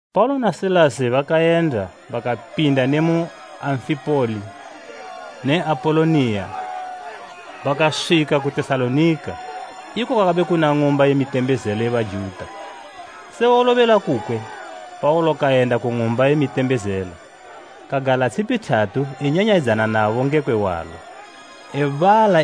Paulo na Silasi bakayenda bakapinda ne mu Amfipoli ne Apoloniya bakaswika ku Tesalonika, iko kwakabe kuna ng'umba ye mitembezelo ye Bajuta. Se wolobela kukwe Paulo kayenda ku ng'umba ye mitembezelo. Kagala tshipi thatu enyanyayidzana nabo ngekwe hwalo, ebala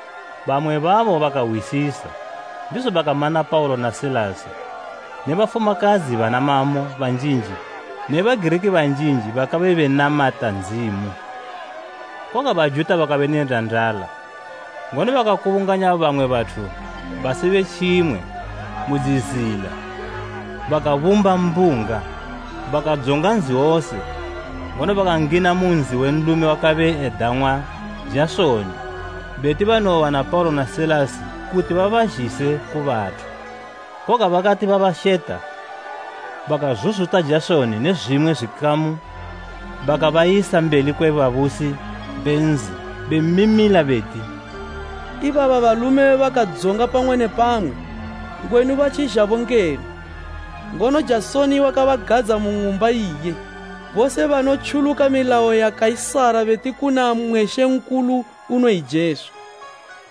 Bamwe babo bakahwisisa, ndizo bakama na Paulo na Silasi; ne bafumakadzi bana mamo banjinji ne Bagiriki banjinji bakabe benamata Ndzimu. Koga Bajuta bakabe ne ndandala, ngono bakakubunganya bamwe bathu basibe tjimwe mu dzizila bakabumba mbunga. Bakadzonga nzi wose, ngono bakangina mu nzi we nlume wakabe edang'wa Jasoni, beti banowowana Paulo na Silasi kuti babazhise ku bathu. Koga bakati babasheta, bakazuzuta Jasoni ne zwimwe zwikamu bakabayisa mbeli kwe babusi be nzi bemimila beti, “Ibaba balume bakadzonga pamwe ne pamwe! Ngwenu batjizhabo ngeno, ngono Jasoni wakabagadza mu ng'umba iye. Bose banotjuluka milayo ya Kaisara, beti kuna mmwe mambo, unoyi Jesu.”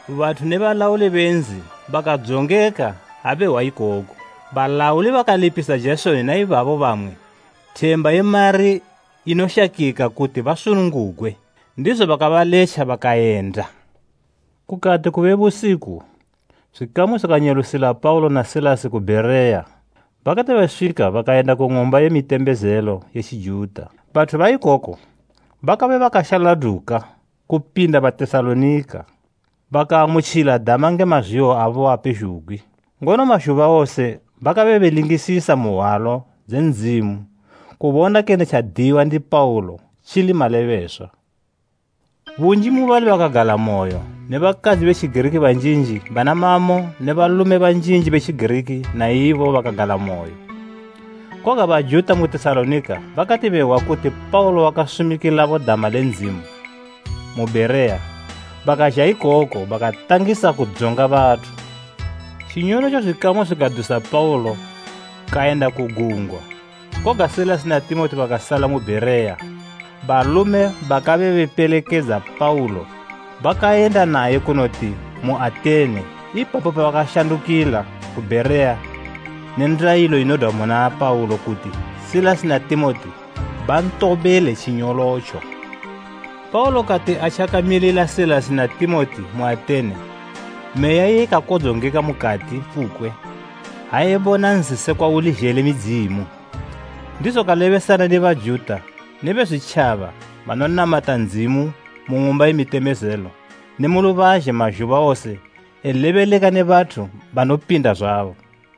Bathu ne balauli be nzi bakadzongeka ha behwa ikoku. Balauli bakalipisa Jasoni na ibabo bamwe, themba ye mari inoshakika kuti basunungugwe, ndizo bakabaletja bakayenda. Kukati kube busiku, zwikamu zwikanyelusila Paulo na Silasi ku Bhereya. Bakati beswika bakayenda ku ng'umba ye mitembezelo ye Tjijuta. Bathu baikoko bakabe bakashaladuka kupinda Batesalonika. Bakaamutjila dama nge mazwihwo abo wose, ngono mazhuba wose bakabe belingisisa mu Hwalo dze Ndzimu kubona kene tjadiyiwa ndi Paulo tjili malebeswa. Bunji mubali bakagalamoyo; ne bakadzi be Tjigiriki banjinji bana mamo ne balume banjinji be Tjigiriki na ibo bakagalamoyo. Koga Bajuta mu Tesalonika bakati behwa kuti Paulo wakasumikilabo dama le Ndzimu mu Bhereya, bakazha ikoko bakatangisa kudzonga bathu. Tjinyolotjo zwikamu zwikadusa Paulo kayenda ku gungwa; koga Silasi na Timoti bakasala mu Bhereya. Balume bakabe bepelekedza Paulo bakayenda naye kunoti mu Atene ipapo bakashandukila ku Bhereya ne ndayilo inodwa muna Paulo kuti Silasi na Timoti bantobele tjinyolotjo. Paulo kati atjakamilila Silasi na Timoti mu Atene meya iye ikakodzongeka mukati kukwe ha ebona nzi sekwa uli zhele midzimu. Ndizo kalebesana ne Bajuta ne Bezwitjaba banonamata Ndzimu mu ng'umba ye mitembezelo ne mu lubazhe mazhuba wose elebeleka ne bathu banopinda zwabo.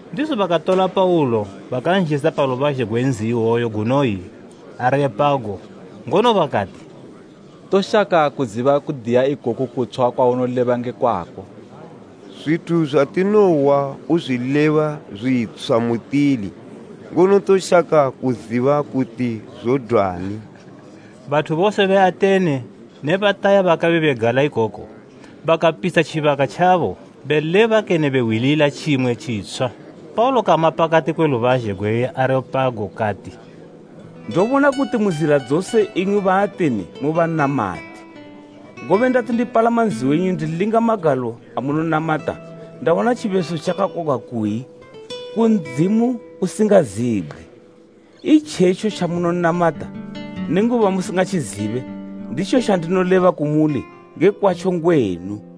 Ndizo bakatola Paulo bakanzhisa pa lubazhe gwe nzi iwoyo gunoyi Areopago, ngono bakati, “Toshaka kuziba kudiya ikoku kutshwa kwaunoleba nge kwako. Zwithu zwatinohwa uzwileba zwitshwa mutili, ngono toshaka kuziba kuti zodwani.” Bathu bose be Atene ne bataya bakabe begala ikoko bakapitsha tjibaka tjabo beleba kene behwilila tjimwe tjitshwa. Paulo kama pakati kwe lubazhe gwe Areopago kati, “Ndobona kuti mu zila dzose imwi Baatene mu banamati. Ngobe ndati ndipalama nzi wenyu ndilinga magalo amunonamata, ndawana tjibeso tjakakwagwa kuyi, ‘Ku Ndzimu usingazibgwe.’ Itjetjo tjamunonamata, nenguba musingatjizibe, nditjo tjandinoleba kumuli nge kwatjo ngwenu.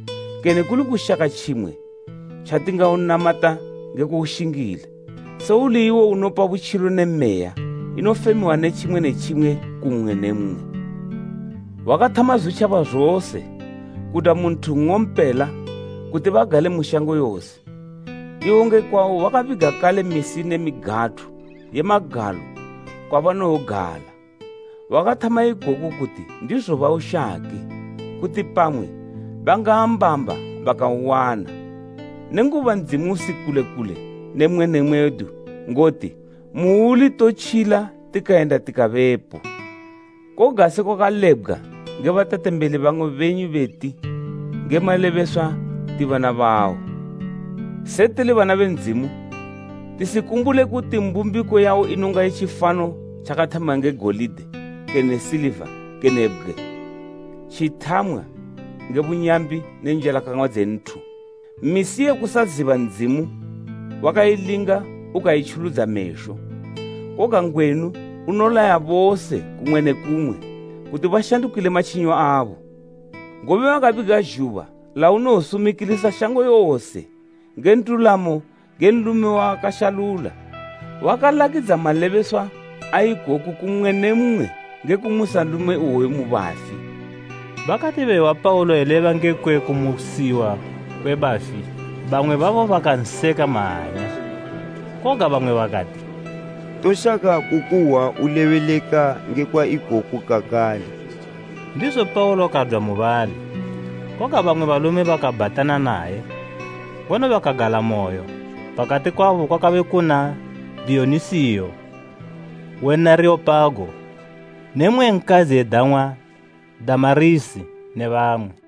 kene kuli kushaka tjimwe tjatingaunamata nge kuushingila, se uli iwo unopa butjilo ne meya inofemiwa ne tjimwe ne tjimwe ku mmwe ne mmwe. Wakathama zwitjaba zose kudwa mu nthu nng'ompela kuti bagale mu shango yose. Iwo nge kwawo wakabiga kale misi ne migathu ye magalo kwabanowogala. Wakathama ikoku kuti ndizo baushake, kuti pamwe bangaambamba bakauwana. Nenguba Ndzimu usi kule kule ne mmwe ne mmwe wedu ngoti; ‘Muuli totjila tikayenda tikabepo.’ “Koga sekwa kalebgwa nge batetembeli bamwe benyu beti, ‘Nge malebeswa ti bana bawo.’ “Se tili bana be Ndzimu, tisikumbule kuti mbumbiko yawo inonga ye tjifano tjakathamwa nge golide kene siliva kene bgwe, tjithamwa nge bunyambi ne njalakang'wa dze nthu. Misi ye kusaziba Ndzimu wakailinga ukaitjuludza mesho, koga ngwenu unolaya bose kumwe ne kumwe kuti bashandukile matjinyo abo. Ngobe wakabiga zhuba launowosumikilisa shango yose nge ndulamo nge nlume wawakashalula. Wakalakidza malebeswa a ikoku ku mmwe ne mmwe nge kumusa nlume iwoyo mu bafi!” Bakati behwa Paulo eleba ngekwe kumusiwa kwe bafi, bamwe babo bakanseka mahanya, koga bamwe bakati, “Toshaka kukuhwa ulebeleka ngekwa ikoku kakale.” Ndizo Paulo kadwa mubali. Koga bamwe balume bakabhatana naye, ngono bakagalamoyo, pakati kwabo kwakabe kuna Diyonisiyo we N'areopago; N'areopago: Mmwe we Areopago. ne mmwe nkadzi edang'wa Damarisi ne bamwe.